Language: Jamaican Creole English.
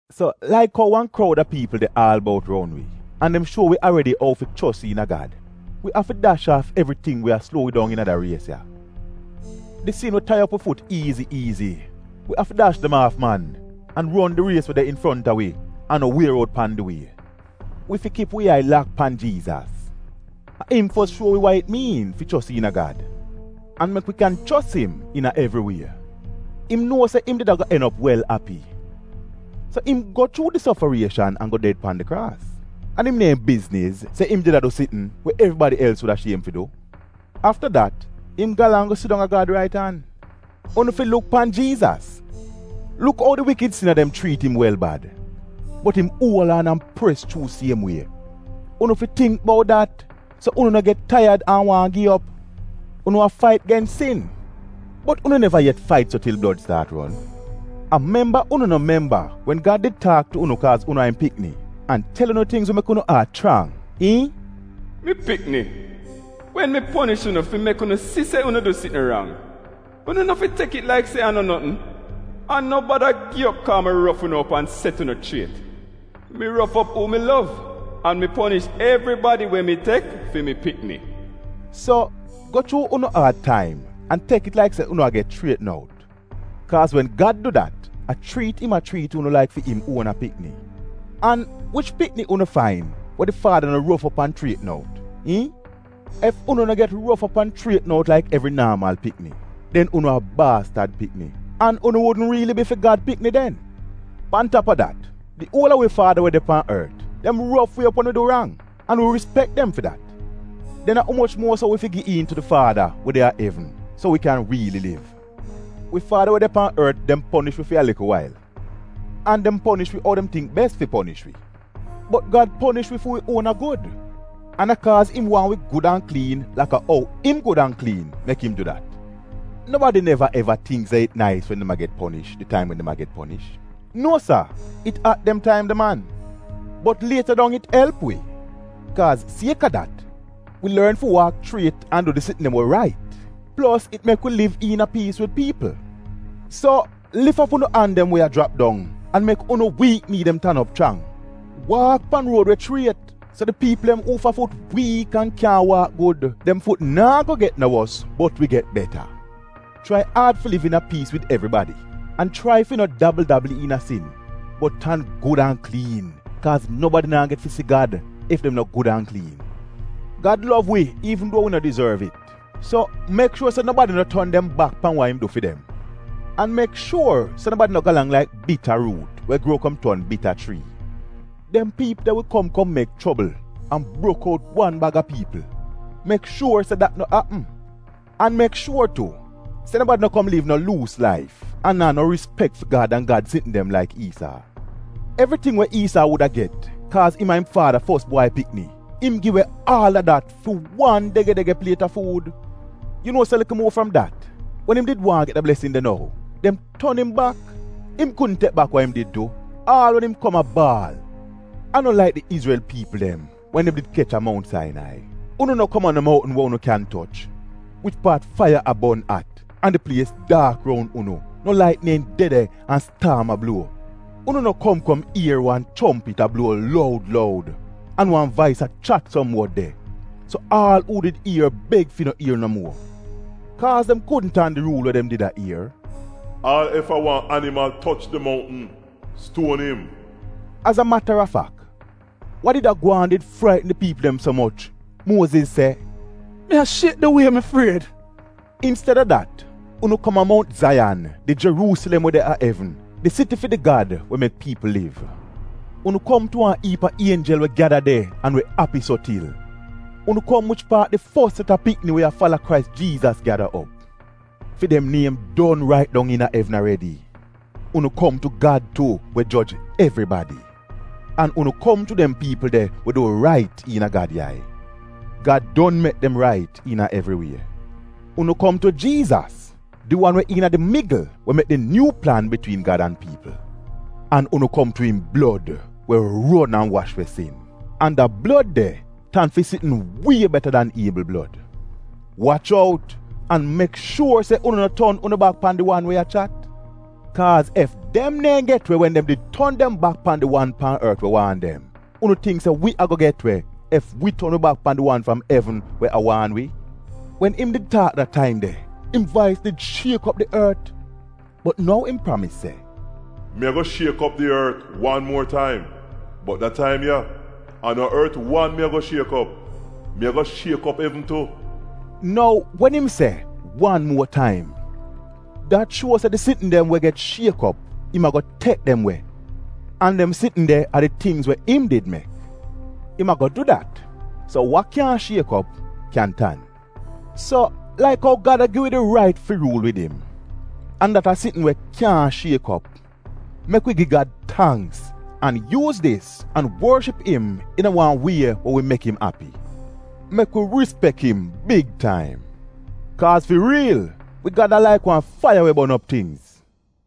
So laik ou wan kroud a piipl de aal bout roun wi, an dem shuo wi aredi ou fi chos iina Gad, wi afi dash aaf evriting we a sluo wi dong iina da ries ya. Di sin we tai op wi fut iizi iizi, wi afi dash dem aaf man, an ron di ries we de infronta wi an no wier out pan di wie. Wi fi kip wi yai lak pan Jiizas. A im fos shuo wi wa it miin fi chos iina Gad, an mek wi kyan chos im iina evri wie. Im nuo se im did ago en op wel api, so im go chuu di sofarieshan an go ded pan di kraas, an im neehn bizniz se im did a du sitn we evribadi els wuda shiem fi du. Afta dat im galang go sidong a Gad rait an. Unu fi luk pan Jiizas, luk ou di wikid sina dem chriit im wel bad, bot im uol aan an pres chuu siem wie. Unu fi tingk bout dat so unu no get taiyad an waahn gi op. Unu a fait gens sin, bot unu neva yet fait so til blod staat ron. A memba unu no memba wen iina Gad did taak tu unu laik se unu a im pikni, an tel unu tingz we mek unu aat chrang? Iihn? “Mi pikni, wen mi ponish unu fi mek unu si se unu du sitn rang, unu no fi tek it laik se a no notn, an no bada gi op kaaz mi rof unu op an set unu chriet, Mi rof op uu mi lov, an mi ponish evribadi we mi tek fi mi pikni.” So, go chuu unu aad taim an tek it laik se unu a get chrietn out, kaaz wen Gad du dat a chriit im a chriit unu laik fi im uona pikni. An wich pikni unu fain we di faada no rof op an chrietn out? iihn? Ef unu no get rof op an chrietn out laik evri naamal pikni, den unu a baastad pikni, an unu wudn riili bi fi Gad pikni den. Pan tap a dat, di uol a wi faada we de pan ort, dem rof wi op wen wi du rang, an wi rispek dem fi dat. Den a umoch muo so wi fi gi iin tu di faada we de a evn so wi kyan riili liv. Wi faada we de pan ort, dem ponish wi fi wan likl wail, an dem ponish wi ou dem tingk bes fi ponish wi. Bot Gad ponish wi fi wi uona gud, an a kaaz im waahn wi gud an kliin laka ou im gud an kliin mek im du dat. Nobadi neva eva tingk se it nais wen dem a get ponish di taim wen dem a get ponish — nuo sa it at dem taim de man. Bot lieta dong it elp wi. Kaaz sieka dat, wi lorn fi waak chriet an du di sitn dem we rait, plos it mek wi liv iina piis wid piipl. So lif op unu an dem we a jrap dong an mek unu wiik nii dem tan op chrang. Waak pan ruod we chriet so di piipl dem uufa fut wiik an kyaahn waak gud, dem fut naa go get no wos, bot wi get beta. Chrai aad fi liv iina piis wid evribadi, an chrai fi no dabl-dabl iina sin bot tan gud an kliin kaaz nobadi naa get fi si Gad ef dem no gud an kliin. Gad lov wi iivn duo wi no dizorv it, so mek shuor se nobadi no ton dem bak pan wa im du fi dem. An mek shuor se nobadi no galang laik bita ruut we gruo kom ton bita chrii. Dem piipl de wi kom kom mek chobl an brok out wan baga piipl. Mek shuor se dat no apm. An mek shuor tu, se nobadi no kom liv no luus laif an naa no rispek fi Gad an Gad sitn dem laik Iisaa. Evriting we Iisaa wuda get kaaz im a im faada fos bwai pikni, im gi we aal a dat fi wan dege-dege pliet a fuud. Yu nuo se likl muo fram dat wen im did waahn get da blesn de nou, dem ton im bak. Im kudn tek bak wa im did du, aal wen im kom a baal. A no laik di Izrel piipl dem wen dem did kech a Mount Sainai, unu no kom a no mountn we unu kyan toch, wich paat faiya a bon at, an di plies daak roun unu; no lait neehn de de an staam a bluo. Unu no kom kom ier wan chompit a bluo loud loud an wan vais a chat som wod de, so aal uu did ier beg fi no ier no muo. Kaaz dem kudn tan di ruul we dem did a ier: ‘Aal ef a wan animal toch di moutn, stuon im.’ Az a matarfak wa did a gwaan did fraitn di piipl dem so moch, Muoziz se, ‘Mi a shiek di wie mi fried.’ Insteda dat, unu kom a Mount Zaiyan, di Jeruusilem we de a evn, di siti fi di Gad we mek piipl liv. Unu kom tu wan iip a ienjel we gyada de an we api so til. Unu kom wich paat di fos set a pikni we a fala Krais Jiizas gyada op. Fi dem niem don rait dong iina evn aredi. Unu kom tu Gad tu, we joj evribadi. An unu kom tu dem piipl de we du rait iina Gad yai. Gad don mek dem rait iina evri wie. Unu kom tu Jiizas, di wan we iina di migl we mek di nyuu plan bitwiin Gad an piipl. An unu kom tu im blod, we ron an wash we sin, an da blod de tan fi sitn wie beta dan Iebl blod. Wach out an mek shuor se unu no ton unu bak pan di wan we a chat! Kaaz ef dem neehn get we wen dem did ton dem bak pan di wan pan ort we waan dem, unu tingk se wi ago get we ef wi ton wi bak pan di wan fram evn we a waan wi? Wen im did taak da taim de, im vais did shiek op di ort, bot nou im pramis se, “Mi ago shiek op di ort wan muo taim, bot da taim ya a no ort wan mi ago shiek op, mi ago shiek op evn tu.” Nou wen im se, ‘wan muo taim,’ dat shuo se di sitn dem we get shiek op im ago tek dem we, an dem sitn de a di tingz we im did mek. Im ago du dat so wa kyaahn shiek op, kyan tan. So laik ou Gad a gi wi di rait fi ruul wid im, an dat a sitn we kyaahn shiek op, mek wi gi Gad tangks an yuuz dis an worship im iina wan wie we wi mek im api. Mek wi rispek im big taim. Kaaz fi riil, wi Gad a laik wan faiya we bon op tingz.